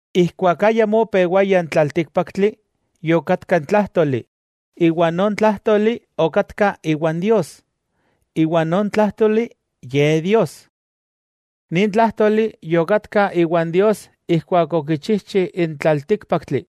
Ijkuak ayamó opewaya n tlaltíkpaktli, yokatka n Tlájtoli, iwa non Tlájtoli okatka iwan Dios, iwa non Tlájtoli Ye Dios. Nin Tlájtoli yokatka iwan Dios ijkuak okichijchi n tlaltíkpaktli.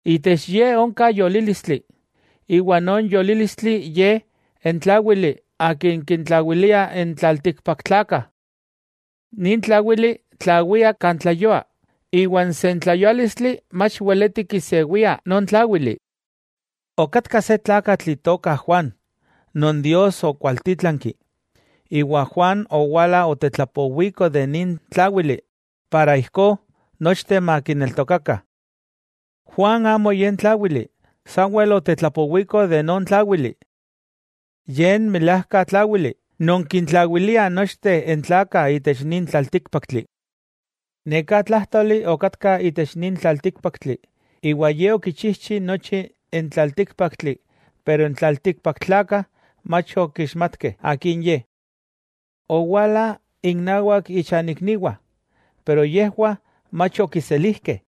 Itech Ye onka Yolílistli, iwa non Yolílistli Ye n Tláwili Akin kintlawilia n tlaltikpaktlakah. Nin Tláwili tlawia kan tleyua, iwa n sentleyuálistli mach weleti kisewia non Tláwili. Okatka se tlakatl itoka Juan, non Dios okwaltítlanki. Juan owala otetlapowiko de nin Tláwili (Cristo), para ijkó nochteh makineltokakah. Juan amo ye n Tláwili, sanwel otetlapowiko de non Tláwili. Ye n milajka Tláwili, non kintlawilia nochteh n tlakah itech nin tlaltíkpaktli. Neka Tlájtoli okatka itech nin tlaltíkpaktli, iwa Ye okichijchi nochi n tlaltíkpaktli pero n tlaltikpaktlakah mach okixmatkeh akin Ye. Owala innawak ichanikniwah, pero yejwah mach okiselijkeh.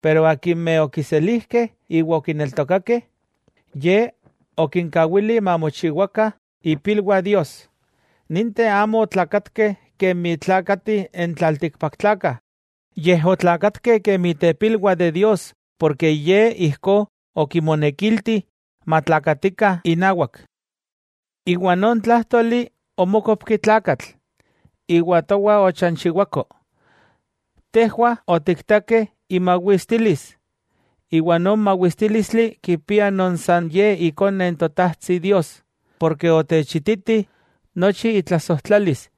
Pero akimeh okiselijkeh iwa okineltokakeh, Ye okinkawili mamochiwakah ipilwah Dios. Ninteh amo otlakatkeh kemi tlakatih n tlaltikpaktlakah, yej otlakatkeh kemi tepilwah de Dios porke Ye ijkó okimonekilti matlakatikah inawak. Non Tlájtoli omókopki Tlakatl, iwa towa ochanchiwako. Tejwah otiktakeh imawistilis, iwa non mawistílistli kipia non san Ye ikone n Totajtsi Dios, porke otechititi nochi itlasojtlalis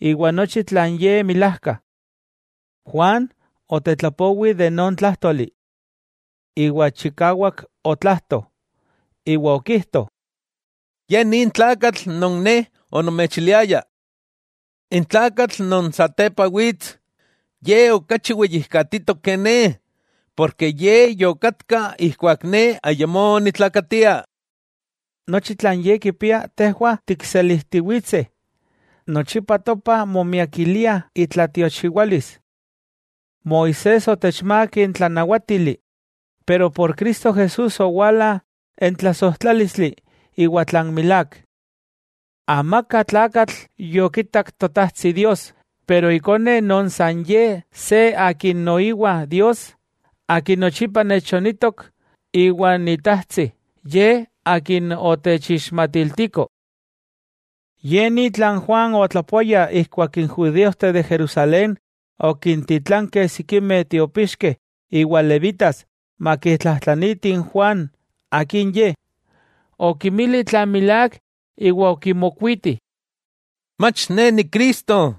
iwa nochi tlan ye milajka. Juan otetlapowi de non Tlájtoli. Iwa chikawak otlajto, iwa okijto: —Ye nin tlakatl non ne onomechiliaya. N tlakatl non satepa wits, Ye okachi weyijkatitok ke ne, porke Ye yokatka ijkuak ne ayamó onitlakatia. Nochi tlan Ye kipia tejwah tikselijtiwitseh, nochipa topah momiakilia itlatiochiwalis. Moisés otechmák n tlanawátili, pero por Cristo Jesús owala n tlasojtlálistli iwa tlan milák. Amaka tlakatl yokitak Totajtsi Dios, pero Ikone non san Ye se Akin noiwa Dios, Akin nochipa nechonitok iwan Itajtsi, Ye Akin otechixmatiltiko. Ye ni tlan Juan otlapoaya ijkuak n judíojteh de Jerusalén okintitlankeh sikimeh tiopixkeh iwa levitas makitlajtlanitih n Juan akin ye. Okimili tlan milák iwa okimokuiti: —Mach ne ni Cristo.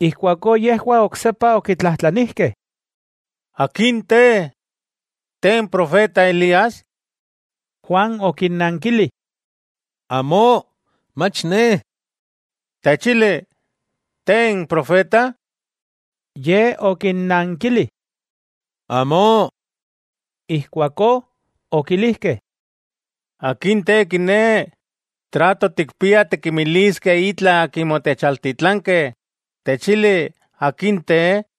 Ijkuakó yejwah oksepa okitlajtlanijkeh: —¿Akin te? ¿Te n profeta Elías? Juan okinnankili: —Amó, mach ne. —Techili, ¿Te n profeta? Ye okinnankili: —Amó. Ijkuakó okilijkeh: —¿Akin te kiné? Moneki tikinmiliskeh itla akimeh otechaltitlankeh. ¿Techili, akin te?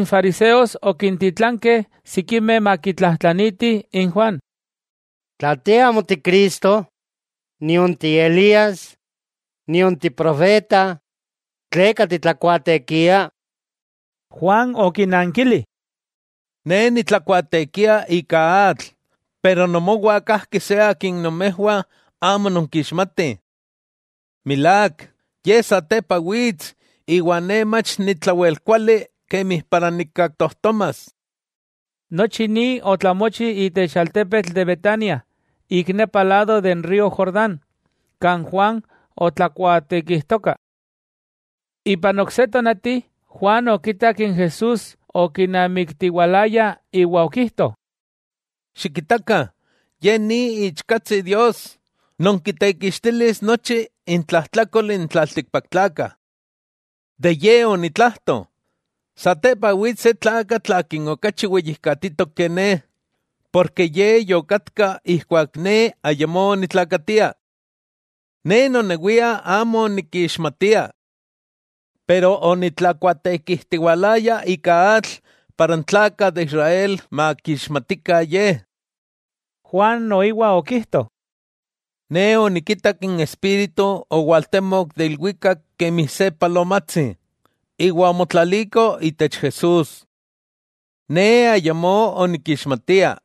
N fariseos okintitlankeh sikimeh makitlajtlanitih n Juan —Tla te amo Ti Cristo, nion ti Elías, nion ti profeta, ¿tleka titlakuaatekia? Juan okinnankili: —Ne nitlakuaatekia ika atl, pero nomowah kajki se Akin nomejwah amo nonkixmatih. Milák, Ye satepa wits, iwa ne mach nitlawelkuali kemi para nikkaktojtomas. Nochi ni otlamochi itech altepetl de Betania, ik nepa lado de n río Jordán, kan Juan otlakuaatekijtoka. Ipan ok se tonati, Juan okitak n Jesús okinamiktiwalaya iwa okijto: —Xikitakah, Ye Ni Iichkatsi Dios, non kitekixtilis nochi intlajtlakol n tlaltikpaktlakah. De Ye onitlajto: “Satepa wits se tlakatl Akin okachi weyijkatitok ke ne, porke Ye yokatka ijkuak ne ayamó onitlakatia.” Ne nonewia amo onikixmatia. Yika onitlakuaatekijtiwalaya ika atl para n tlakah de Israel makixmatikah Ye. Juan noiwa okijto: —Ne onikitak n Espíritu owaltemok de ilwikak kemi se palomatsi, iwa omotlaliko itech Jesús. Ne ayamó onikixmatia.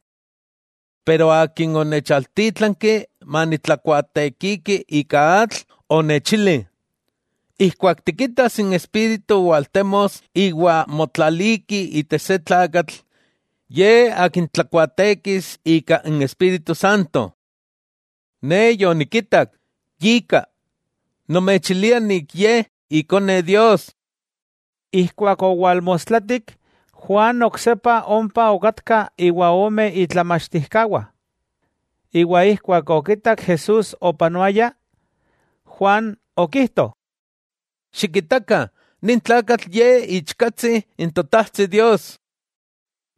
Pero Akin onechaltítlanki manitlakuaatekiki ika atl, onechili: “Ijkuak tikitas n Espíritu waltemos iwa motlaliki itech se tlakatl, Ye Akin tlakuaatekis ika n Espíritu Santo.” Ne yonikitak, yika, nomechilia nik Ye Ikone Dios. Ijkuak owalmostlatik Juan oksepa ompa okatka iwa ome itlamachtijkawah. Iwa ijkuak okitak Jesús opanoaya, Juan okijto: —Xikitakah, nin tlakatl Ye Iichkatsi n Totajtsi Dios.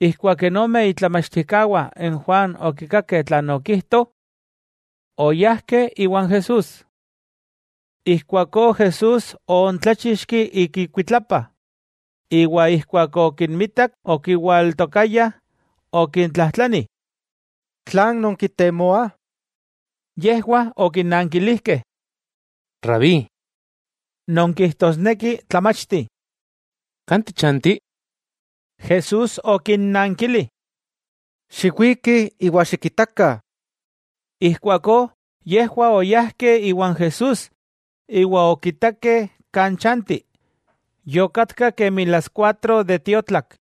Ijkuak n ome itlamachtijkawah n Juan okikakeh tlan okijto, oyajkeh iwan Jesús. Ijkuakó Jesús oontláchixki ik ikuitlapa, iwa ijkuak okinmitak okiwaltokayah, okintlajtlani: —¿Tlan nonkitemoah? Yejwah okinankilijkeh: —Rabí —non kijtosneki tlamachti—, ¿kan tichanti? Jesús okinnankili: —Xiwikih iwa xikitakah. Ijkuakó yejwah oyajkeh iwan Jesús iwa okitakeh kan chanti. Yokatka kemi las kuatro de tiotlak.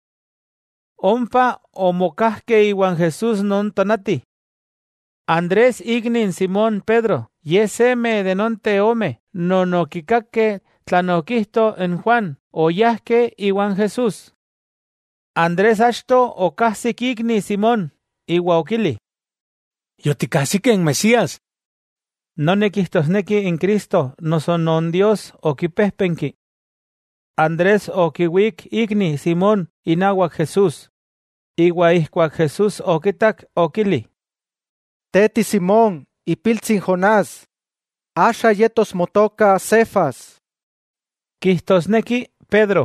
Ompa omokajkeh iwan Jesús non tonati. Andrés ikni n Simón Pedro, ye seme de nonteh ome non okikakeh tlan okijto n Juan, oyajkeh iwan Jesús. Andrés achto okajsik ikni Simón, iwa okili: —Yotikajsikeh n Mesías —noni kijtosneki n Cristo noso non Dios okipéjpenki. Andrés okiwík ikni Simón inawak Jesús, iwa ijkuak Jesús okitak okili: —Te ti Simón ipiltsi n Jonás, axa yetos motoka Cefas —kijtosneki Pedro.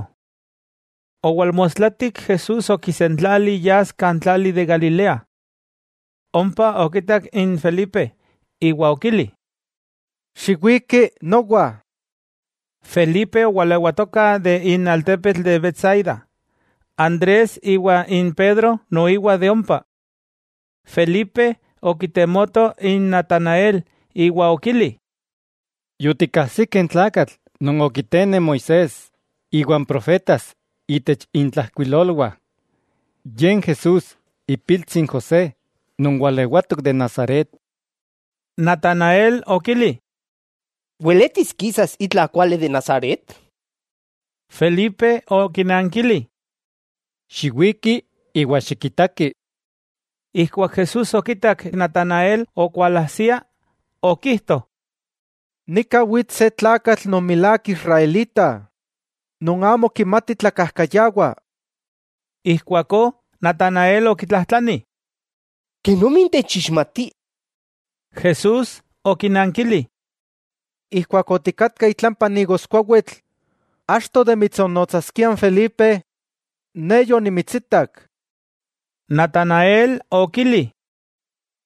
Owalmostlatik Jesús okisentlali yas kan tlali de Galilea. Ompa okitak n Felipe, iwa okili: —Xiwiki nowa. Felipe owalewatoka itech altepetl de Betsaida. Andrés iwa n Pedro noiwa de ompa. Felipe okitemoto n Natanael iwa okili: —Yotikajsikeh n tlakatl non okitene Moisés iwa n profetas itech intlajkuilolwah. Ye n Jesús ipiltsi n José non walewatok de Nazaret. Natanael okili: —¿Weletis kisas itla kuali de Nazaret? Felipe okinankili: —Xiwiki, iwa xikitaki. Ijkuak Jesús okitak Natanael okualajsia, okijto: —Nika wits se tlakatl non milák Israelita, non amo kimati tlakajkayawa. Ijkuakó Natanael okitlajtlani: —¿Kenomi techixmati? Jesús okinankili: —Ijkuak otikatka itlampa n igoskuawitl, achto de mitsonnotsaskia n Felipe, Ne yonimitsitak. Natanael okili: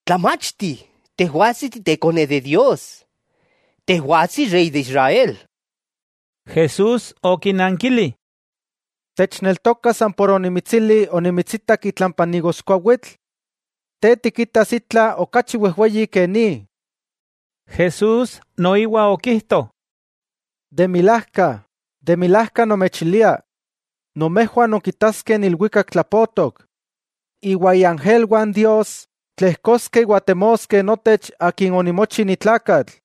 —¡Tlamachti, Tejwatsi Ti Tekone de Dios! ¡Tejwatsi Rey de Israel! Jesús okinankili: —¿Techneltoka san por onimitsili onimitsitak itlampa n igoskuawitl? Te tikitas itla okachi wejweyi ke ni. Jesús noiwa okijto: —De milajka, de milajka nomechilia, nomejwah nonkitaskeh n ilwikak tlapotok, iwa iángelwah n Dios tlejkoskeh iwa temoskeh notech Akin onimochi ni tlakatl.